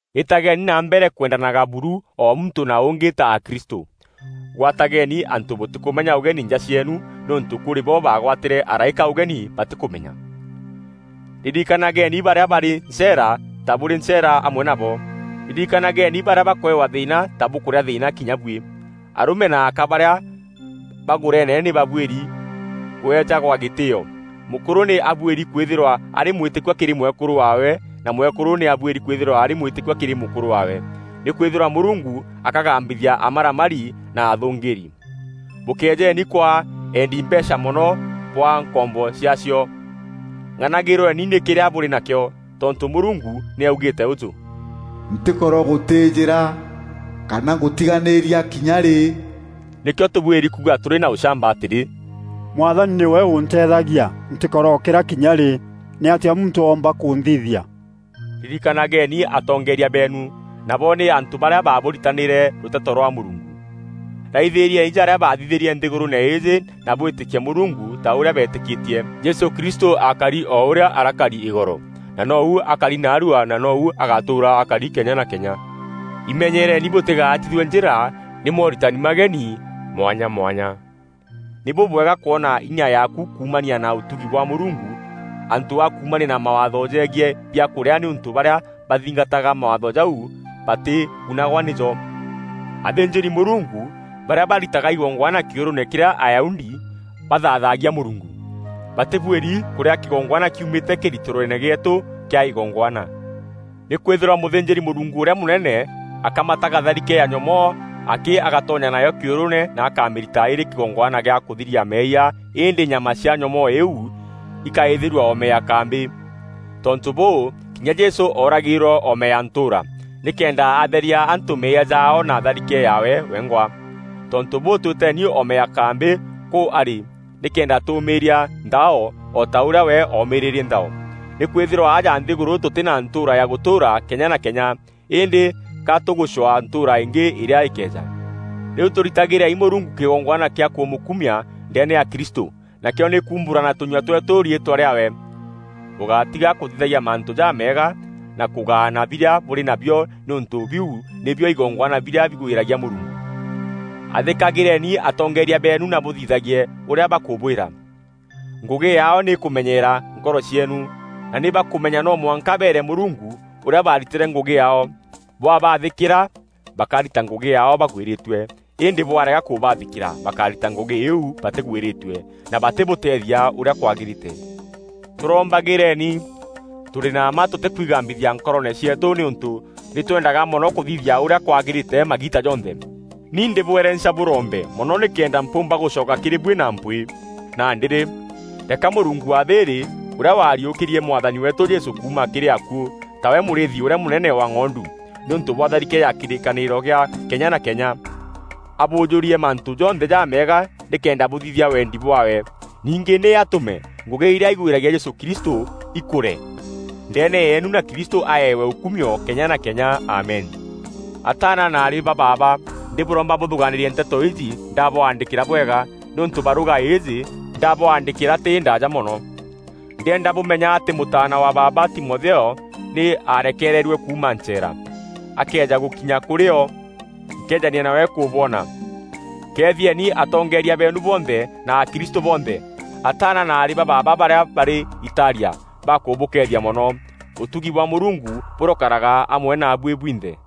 Îtageni na mbere kwendanaga buru o muntû na ûngî ta akristû. Gwatageeni antû bûtîkûmenya ûgeni nja cieenu nîûntû kûrî bo baagwatîre araîka ûgeni batîkûmenya. Ririkanageeni barîa barî ncheera ta bûrî ncheera amwe nabo. Ririkanageeni barîa bakweewa thîîna ta bûkûrîa thîîna kinya buî. Arûme na aka barîa bagûreene nî babuîri kûeejagwa gîtîîo. Mûkûrû nî abuîri kwîthîrwa arî mwîtîkua kîrî mwekûrû waawe na mwekûrû nî abuîri kwîthîrwa arî mwîtîkua kîrî mûkûrû waawe. Nîkwîthîrwa Mûrungu akagambithia amaramari na athûngîîri. Bûkejeeni kwaa eendi mbeecha mono bwaa nkombo ciaacio; ng'anagîrweni nî kîrîa bûrî nakîo. Tontû Mûrungu nî augîîte ûjû, “Ntîkorogûtîîjîra kana ngûtiganîria kinya rî.” Nîkîo tûbuîri kuuga tûrî na ûchamba atîrî, “Mwathani nîwe ûnteethagia, ntîkorokîra kinya rî. Nîatîa muntû oomba kûnthithia?” Ririkanageeni atongeeria beenu, nabo nî antû barîa baabûritanîre rûteto rwa Mûrungu. Raithîrieni jarîa bathithîtie nthîgûrûûne îîjî na bwîtîkie Mûrungu ta ûrîa beetîkîtie. Jesû Kristû akari o ûrîa arakari îgoro, na noou akari naarua na noou agatûûra akari kenya na kenya. Imenyereeni bûtîgaatithue njîra nî mooritani mageni mwanya mwanya. Nî bûbwega kwona inya yaaku kuumania na ûtugi bwa Mûrungu, antû a kuumania na mawaatho jegiî biakûrîa nîûntû barîa bathingataga mawaatho jau batîgunagwa nîjo. Athînjîri-Mûrungu barîa baritaga igongwana kîûrûûne kîrîa Ayahudi bathaathagia Mûrungu, batîbuîri kûrîa kîgongwana kiumîte kîritîroone gîeetû kîa igongwana. Nîkwîthîrwa mûthînjîri-Mûrungu ûrîa mûnene akamataga tharike ya nyomoo akî agatonya nayo kîûrûûne na akamîrita îrî kîgongwana gîa kûthîria meeyia îndî nyama cia nyomoo iu îkaîthîîrua oome ya kambî. Tontû bûû, kinya Jesû ooragîîrwe oome ya ntûûra, nîkenda atheria antû meeyia jaao na tharike yaawe wengwa. Tontû bûû, twîteeni oome ya kambî kûu arî nîkenda tûûmîîria nthao o ta ûrîa we oomîîrîrie nthao. Nîkwîthîrwa aja nthîgûrû tûtî na ntûûra ya gûtûûra kenya na kenya, îndî ka tûgûcwaa ntûûra îngî îrîa îkeeja. Rîu tûrîtagîreni Mûrungu kîgongwana kîa kûmûkumia ndeene ya Kristû, nakîo nî kuumbûra na tûnyua tweetû riîtwa rîaawe. Bûgátiga kûthithagia mantû jameega na kûgaana birîa bûrî nabio nîûntû biu nîbio igongwana birîa bigwîragia Mûrungu. Athîkagîreeni atongeeria beenu na bûthithagie ûrîa bakûbwîra. Ngûgî yaao nî kûmenyeera nkoro cieenu, na nî bakûmenya no mwanka beere Mûrungu ûrîa baaritîre ngûgî yaao. Bwabaathîkîra, bakarita ngûgî yaao bagwîrîtue îndî bwarega kûbaathîkîra bakarita ngûgî îîu batîgwîrîtue, na batîbûteethia ûrîa kwagîrîte. Tûrombagîreeni. Tûrî na mma tûtîkwigambithia nkoroone cieetû nîûntû nî twendaga mono kûthithia ûrîa kwagîrîte magiita jonthe. Ni ndîbwerenca bûrombe mono nîkenda mpûûmba gûcoka kîrî buî na mpwîî. Nandî rî, reeka Mûrungu wa thîîrî ûrîa waariûkîrie Mwathani weetû Jesû kuuma kîrî akuû, tawe mûrîîthi ûrîa mûnene wa ng'ondu, nîûntû bwa tharike ya kîrîkanîro gîa kenya na kenya, abûûjûrie mantû jonthe jameega nîkenda bûthithia wendi bwaawe. Ningî nî atûme ngûgî irîa igwîragia Jesû Kristû ikûre ndeene yeenu na Kristû aaewe ûkumio kenya na kenya. Amen. Ataana na aarî ba baaba ndîbûromba bûthûgaanîrie nteto iji ndabwandîkîra bwega nîûntû barûga ijî ndabwandîkîra tî îndaaja mono. Ndîenda bûmenya atî mûtaana wa baaba Timotheo nî ararekereerue kuuma ncheera. Akëeja gûkinya kûrî o, nkeejania nawe kûbwona. Keethieni atongeeria beenu bonthe na akristû bonthe. Ataana na aarî ba baaba barîa barî Italia bakûbûkeethia mono. Ûtugi bwa Mûrungu bûrokaraga amwe naabuî bwinthe.